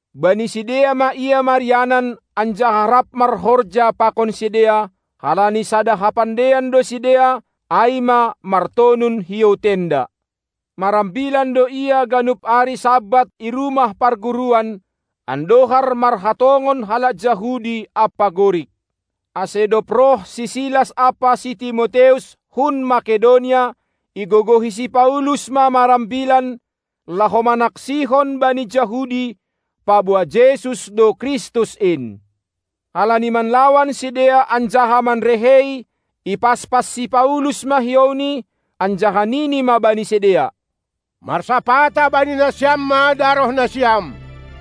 Bani sidea ma ia marianan anjaha rap marhorja pakon sidea, halani sada hapandeian do sidea, ai ma martonun hiou tenda. Marambilan do ia ganup ari Sabat i rumah parguruan, andohar marhatongon halak Jahudi ampa Gorik. Ase dob roh si Silas ampa si Timoteus hun Makedonia, igogohi si Paulus ma marambilan, laho manaksihon bani Jahudi, paboa Jesus do Kristus in. Halani manlawan sidea anjaha manrehei, ipaspas si Paulus ma hiouni, anjaha nini ma bani sidea: Marsapata bani nasiam ma darohnasiam!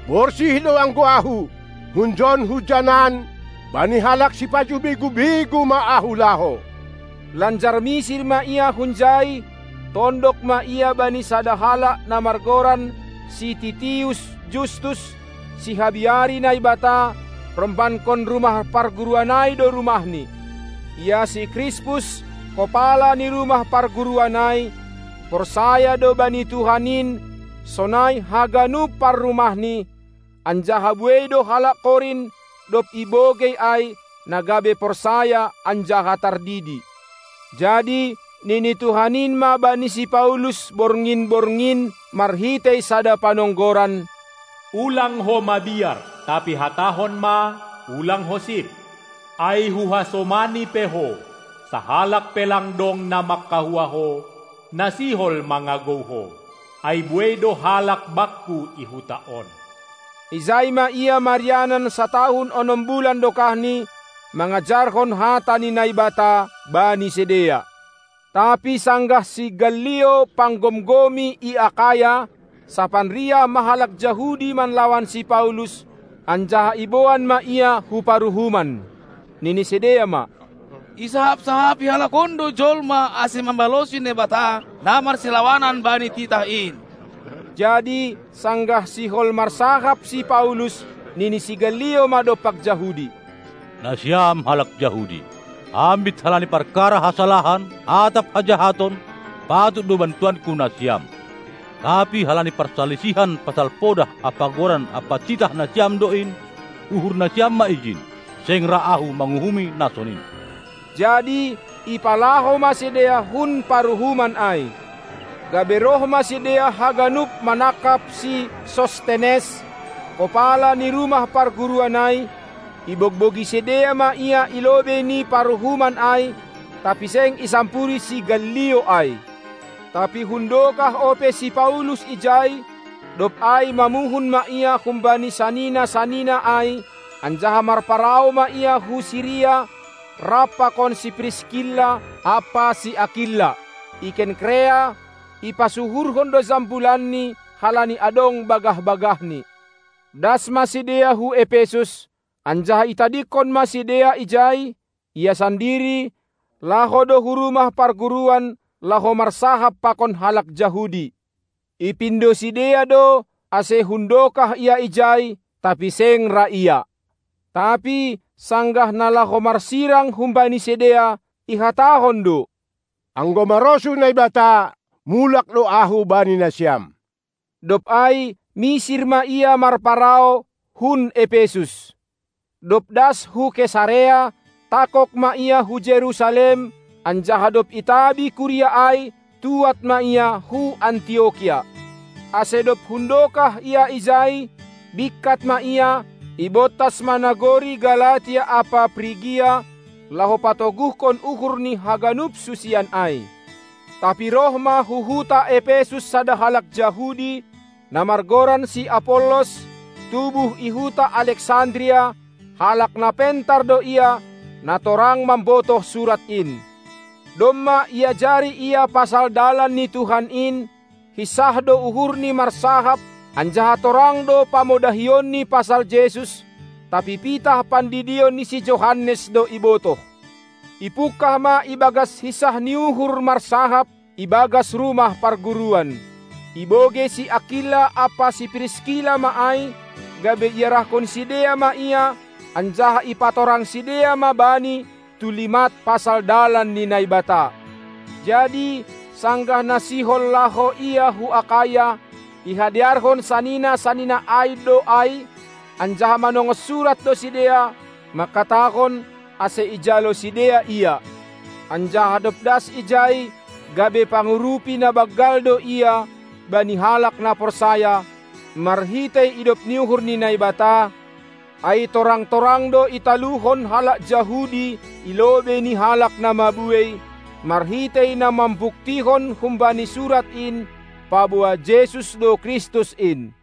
Borsih do anggo ahu. Hunjon-hujanan bani halak sipajuh begu-begu ma ahu laho. Lanjar misir ma ia hunjai, tondok ma ia bani sada halak na margoran si Titius Justus, sihabiari Naibata; rombankon rumah parguruan ai do rumahni. Ia si Krispus, kopala ni rumah parguruan ai, porsaya do bani Tuhan in sonai haganup parrumahni; anjaha buei do halak Korint, dob ibogei ai, na gabe porsaya anjaha tardidi. Jadi nini Tuhan in ma bani si Paulus borngin-borngin marhitei sada panonggoran: Ulang ho mabiar, tapi hatahon ma, ulang ho sip! Ai Huhasomani pe ho, sahalak pe lang dong na mangkahua ho, na sihol mangagou ho; ai buei do halak Bakku i huta on! Ijai ma ia marianan satahun onom bulan dokahni, mangajarhon hata ni Naibata bani sidea. Tapi sanggah si Gallio panggomgomi i Akaya, sapanriah ma halak Jahudi manlawan si Paulus, anjaha iboan ma ia hu paruhuman. Nini sidea ma: Isahap-sahapi halak on do jolma mambalosi Naibata marsilawanan bani titah in. Jadi sanggah sihol marsahap si Paulus, nini si Gallio ma dompak Jahudi: Nasiam halak Jahudi! Ambit halani parkara hasalahan atap hajahaton, patut do bantuanku nasiam. Tapi halani parsalisihan pasal podah ampa goran ampa titah nasiam do in, uhur nasiam ma ijin; seng ra ahu manguhumi na sonin. Jadi ipalaho ma sidea hun paruhuman ai. Gabe roh ma sidea haganup manangkap si Sostenes, kopala ni rumah parguruan ai, ibogbogi sidea ma ia i lobei ni paruhuman ai, tapi seng isampuri si Gallio ai. Tapi hundokah ope si Paulus ijai; dob ai mamuhun ma ia humbani sanina-sanina ai, anjaha marparau ma ia hu Siria, rap pakon si Priskilla ampa si Akilla. I Kenkerea, ipasuhurhon do jambulanni halani adong bagah-bagahni. Das ma sidea hu Epesus, anjaha itadingkon ma sidea ijai; ia sandiri, laho do hu rumah parguruan, laho marsahap pakon halak Jahudi. Ipindo sidea do, ase hundokah ia ijai, tapi seng ra ia. Tapi sanggah na laho marsirang humbani sidea, ihatahon do: Anggo marosuh Naibata, mulak do ahu bani nasiam. Dob ai misir ma ia marparau hun Epesus. Dob das hu Kesarea, tangkog ma ia hu Jerusalem, anjaha dob itabi kuria ai, tuad ma ia hu Antiokia. Ase dob hundokah ia ijai, bingkat ma ia; ibontas ma nagori Galatia ampa Prigia, laho patoguhkon uhur ni haganup susian ai. Tapi roh ma hu huta Epesus sada halak Jahudi, na margoran si Apollos, tubuh i huta Aleksandria; halak na pentar do ia, na torang mambotoh surat in. Domma iajari ia pasal dalan ni Tuhan in, hinsah do uhurni marsahap anjaha torang do pamodahionni pasal Jesus; tapi pitah pandidion ni si Johannes do ibotoh. Ipungkah ma ibagas hinsah ni uhur marsahap i bagas rumah parguruan. Ibogei si Akilla ampa si Priskilla ma ai, gabe iarahkon sidea ma ia, anjaha ipatorang sidea ma bani tulimat pasal dalan ni Naibata. Jadi sanggah na sihol laho ia hu Akaya, ihadearhon sanina-sanina ai do ai, anjaha manongos surat do sidea, mangkatahon, ase ijalo sidea ia. Anjaha dob das ijai, gabe pangurupi na banggal do ia bani halak na porsaya, marhitei idop ni uhur ni Naibata, ai torang-torang do italuhon halak Jahudi i lobei ni halak na mabuei, marhitei na mambuktihon humbani surat in, paboa Jesus do Kristus in.